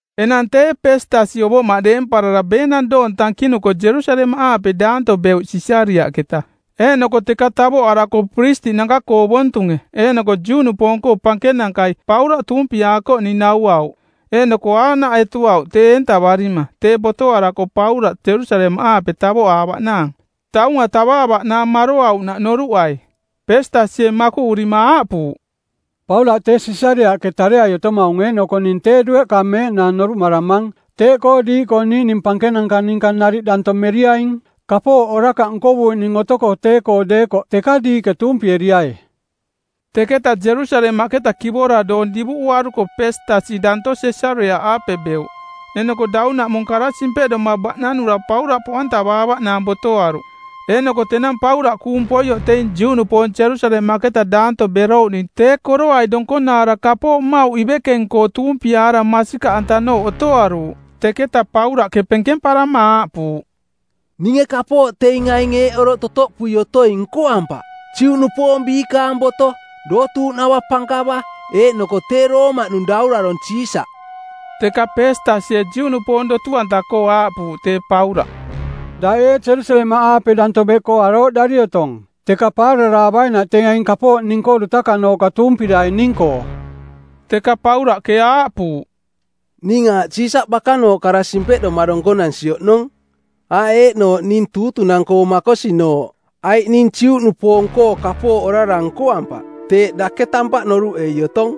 Enang tee Peestasi ovoꞌmaꞌ deemparara beenang doong tankinuko Jerusalemaꞌaape daanto beuꞌ Sisariaꞌketa. Eeꞌnoko teka tavoꞌarako piristiꞌnanka-koo ovontunge eeꞌnoko Juꞌnupoong-koo pankenankai Paulaꞌ tuumpiaakoꞌning nauauꞌ. Eeꞌnoko aaꞌnaꞌ etuauꞌ tee eentavarima tee botoarako Paulaꞌ Jerusalemaꞌaape tavoꞌaavaꞌnaang, taunga tavaavaꞌnaang maroauꞌnaꞌ noruꞌai. Peestasie makuꞌurima aaꞌpuuꞌ, “Paulaꞌ tee Sisariaꞌke tareai otomaung eeꞌnoko ning tee dueꞌka meeꞌnaang noruꞌmaramang. Teeꞌkoo diiꞌkoo niiꞌning pankenanka niꞌninka nariꞌ danto meriaing. Kapooꞌ orakaꞌ nkovuuꞌning otoko tee-koo deekoꞌ teka diiꞌke tuumpieriai.” Teketa Jerusalemaꞌketa kivora doong divuꞌuaruko Peestasi danto Sisariaꞌaape beuꞌ. Eeꞌnoko daunaꞌmung kara simpeꞌdoma baꞌnanura Paulaꞌ poꞌantavaavaꞌnaang botoaruꞌ. Eeꞌnoko tenang Paulaꞌ kuung poioꞌ teing Juꞌnupoong Jerusalemaꞌketa danto berouꞌning tee koroai donkonaara kapooꞌ mmauꞌnanka ivekeng-koo tuumpiaara masikaꞌantanooꞌ otoroaruuꞌ. Teketa Paulaꞌke penkemparama aaꞌpuuꞌ, “Ninge kapooꞌ teing aing eeꞌ oroꞌ totoꞌpui otoing nkoampaꞌ: Juꞌnupoong biikaang boto, dootuuꞌnava pankava eeꞌnoko tee Roomaꞌnung daurarong˜ Siisaꞌ.” Teka Peestasie Juꞌnupoong dotu-anta-koo aaꞌpuuꞌ tee Paulaꞌ, “Daꞌ ee Jerusalemaꞌaape daanto beꞌkoo arooꞌdari otong teka paararaavainaꞌ teing aing kapooꞌ ning-koo dutakanooꞌka tuumpiraining-koo?” Teka Paulaꞌke aaꞌpuuꞌ, “Ning aaꞌ Siisaꞌ bakanooꞌ kara simpeꞌdoma donkonansi oꞌnong, aaꞌ eeꞌnooꞌ ning tuutunang-koo makosinooꞌ, aiꞌ ning Juꞌnupoong-koo kapooꞌ orara nkoampaꞌ, teeꞌ dake tampaꞌ noruꞌei otong.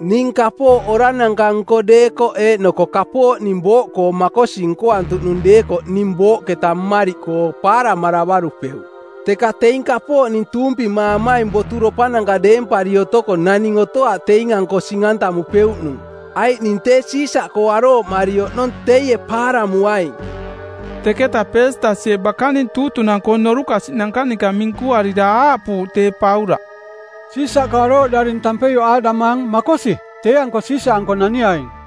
Ning kapooꞌ orarananka-nko deekoꞌ eeꞌnoko kapooꞌ ning booꞌkoo makosi nkoantuꞌnung deekoꞌ ning booꞌketa mmariꞌkoo paaramaravarupeuꞌ, teka teing kapooꞌ ning tuumpimaamaing boturopananka deempari otoko naning otoaꞌ teing-anko sing-antamupeuꞌnung, aiꞌ ning tee Siisaꞌkoo arooꞌmari oꞌnong teie paaramuaing.” Teketa Peestasie bakaning tuutunang-koo˜ norukasiꞌnanka ninka minkuarira aaꞌpuuꞌ tee Paulaꞌ, “Siisaꞌkoo arooꞌdaring tampeioꞌ aaꞌdamaang: Makosi, tee-anko Siisaꞌanko naniaing.”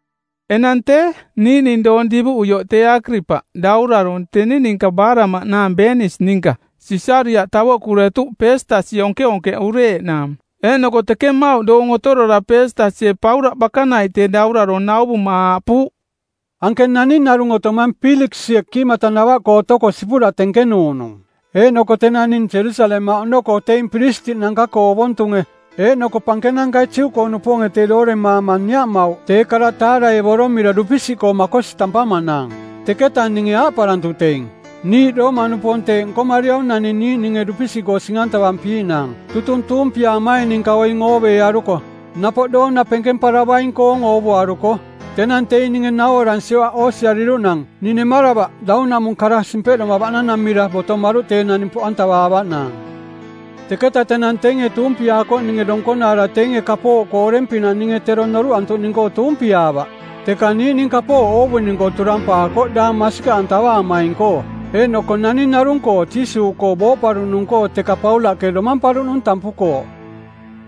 Enang tee, niiꞌning doong divuꞌuioꞌ tee Akiripaꞌ, daurarong˜, teni ninka baaraꞌmaꞌnaang Beenis ninka, Sisariaꞌ tavoꞌkuretuꞌ Peestasi onkeonkeꞌureeꞌnaang. Eeꞌnoko teke mmauꞌ doong otorora Peestasie Paulaꞌ bakanaiꞌ tee daurarong nauvuma aaꞌpuuꞌ, “Anke naning narung otomang Piiliksie kiimatanava-koo otoko sipura tenkenuuꞌnung. Eeꞌnoko tenang ning Jerusalemaꞌ oꞌnoko teing piristiꞌnanka-koo ovontunge eeꞌnoko pankenankai Juꞌkoo-nupoonge tee dooremaama niaꞌmauꞌ tee kara taaraevomira dupisiꞌkoo makosi tampamaꞌnaang. Teketa ninge aaꞌparantuꞌ teing, ‘Niiꞌ Roomaꞌnupoong teeꞌ nkomariaung naning niiꞌninge dupisiꞌkoo sing-antavampiiꞌnaang tutung tuumpiaamaing ninka oing ooveearuko, napoꞌ doona penkemparavaing-koong oovuaruko.’ “Tenang teing ninge nauaransioꞌ aꞌ oosiariruꞌnang ning nemaravaꞌ daunaꞌmung kara simpeꞌdoma baꞌnanamira botomaruꞌ tee naning poꞌantavaavaꞌnaang. Teketa tenang teinge tuumpiaakoꞌninge donkonaara teinge kapooꞌkoo oreng-pinaꞌ ninge tero noruꞌantuꞌning-koo tuumpiaavaꞌ. Teka niiꞌning kapooꞌ oovuning-koo turampaakoꞌ daang masikaꞌantavaamaing-koo, eeꞌnoko naning narung-koo Jiisuuꞌkoo booꞌparuꞌnung-koo teka Paulaꞌke domamparuꞌnung tampukooꞌ.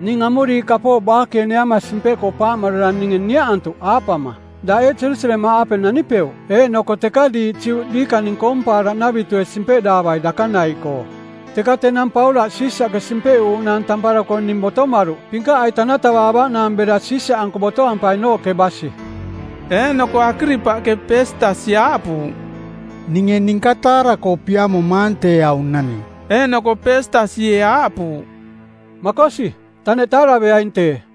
Ning amuriiꞌ kapooꞌ baakeeneama simpeꞌkoo paaꞌmarara ninge niaꞌantuꞌ aaꞌpama, ‘Daꞌ ee Jerusalemaꞌaape nanipeuꞌ eeꞌnoko teka diiꞌ Juꞌ diikaning koompaaraꞌnavitue simpeꞌdaavai dakanaiꞌkoo?’ Teka tenang Paulaꞌ Siisaꞌke simpeꞌuuꞌnaang tamparako ning botomaruꞌ pinkaꞌai tanatavaavaꞌnaang bera Siisaꞌanko botoampainooꞌke basi.” Eeꞌnoko Akiripaꞌke Peestasi aaꞌpuuꞌ, “Ninge ninka taara-koo piamomaang tee aung naning.” Eeꞌnoko Peestasie aaꞌpuuꞌ, “Makosi, taneꞌ taaraveaing tee.”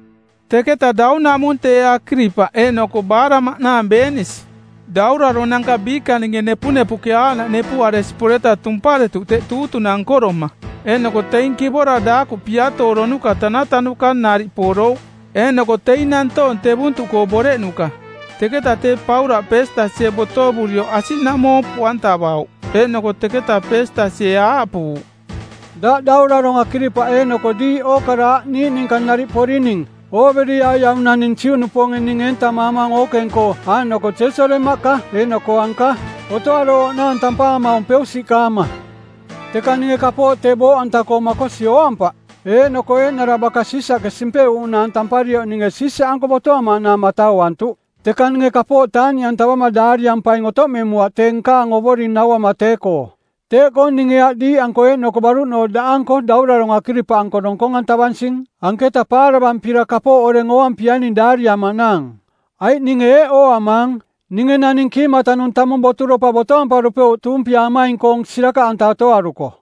Teketa daunaꞌmung tee Akiripaꞌ eeꞌnoko baaraꞌmaꞌnaang Beenis, dauraronanka biikaninge nepunepuꞌke aaꞌnaꞌ nepuꞌaresi poreta tumparetuꞌ teꞌ tuutunang nkoroma eeꞌnoko teing kivora daakuꞌ piatooronuka tanatanuka nariꞌ porouꞌ eeꞌnoko teing nantoong tevuntuꞌkoo boreꞌnuka. Teketa tee Paulaꞌ Peestasie botovurioꞌ asiꞌnaꞌmoo poꞌantavauꞌ. Eeꞌnoko teketa Peestasie aaꞌpuuꞌ, “Daꞌ Daurarong Akiripaꞌ eeꞌnoko diiꞌ ookara aꞌ niiꞌ ninka nariꞌ porining, ooveriai aung naning Juꞌnupoonge ning eentamaamaung ookeng-koo aaꞌnoko Jerusalemaꞌka eeꞌnoko anka, otoarooꞌnaang tampaamaung peusiꞌkaama. Teka ninge kapooꞌ tee booꞌanta-koo makosi ooampaꞌ. Eeꞌnoko eeꞌnara baka Siisaꞌke simpeꞌuuꞌnaang tamparioꞌ ninge Siisaꞌanko botoamaꞌnaang matauantuꞌ. Teka ninge kapooꞌ taaꞌniꞌantavama daariampaing otoꞌmemuaꞌ tee nkaang ovoring nauama tee-koo. Teeꞌkoo ninge aꞌ diiꞌanko, eeꞌnoko baruꞌnooꞌ daꞌanko daurarong Akiripaꞌanko donkong-antavansing anketa paaravampira kapooꞌ oreng ooampiaining daariamaꞌnaang. Aiꞌ ninge eeꞌ ooamaang, ninge naning kiimatanung tamung boturopa botoamparupeuꞌ tuumpiaamaing-koong sirakaꞌanta otoaruko.”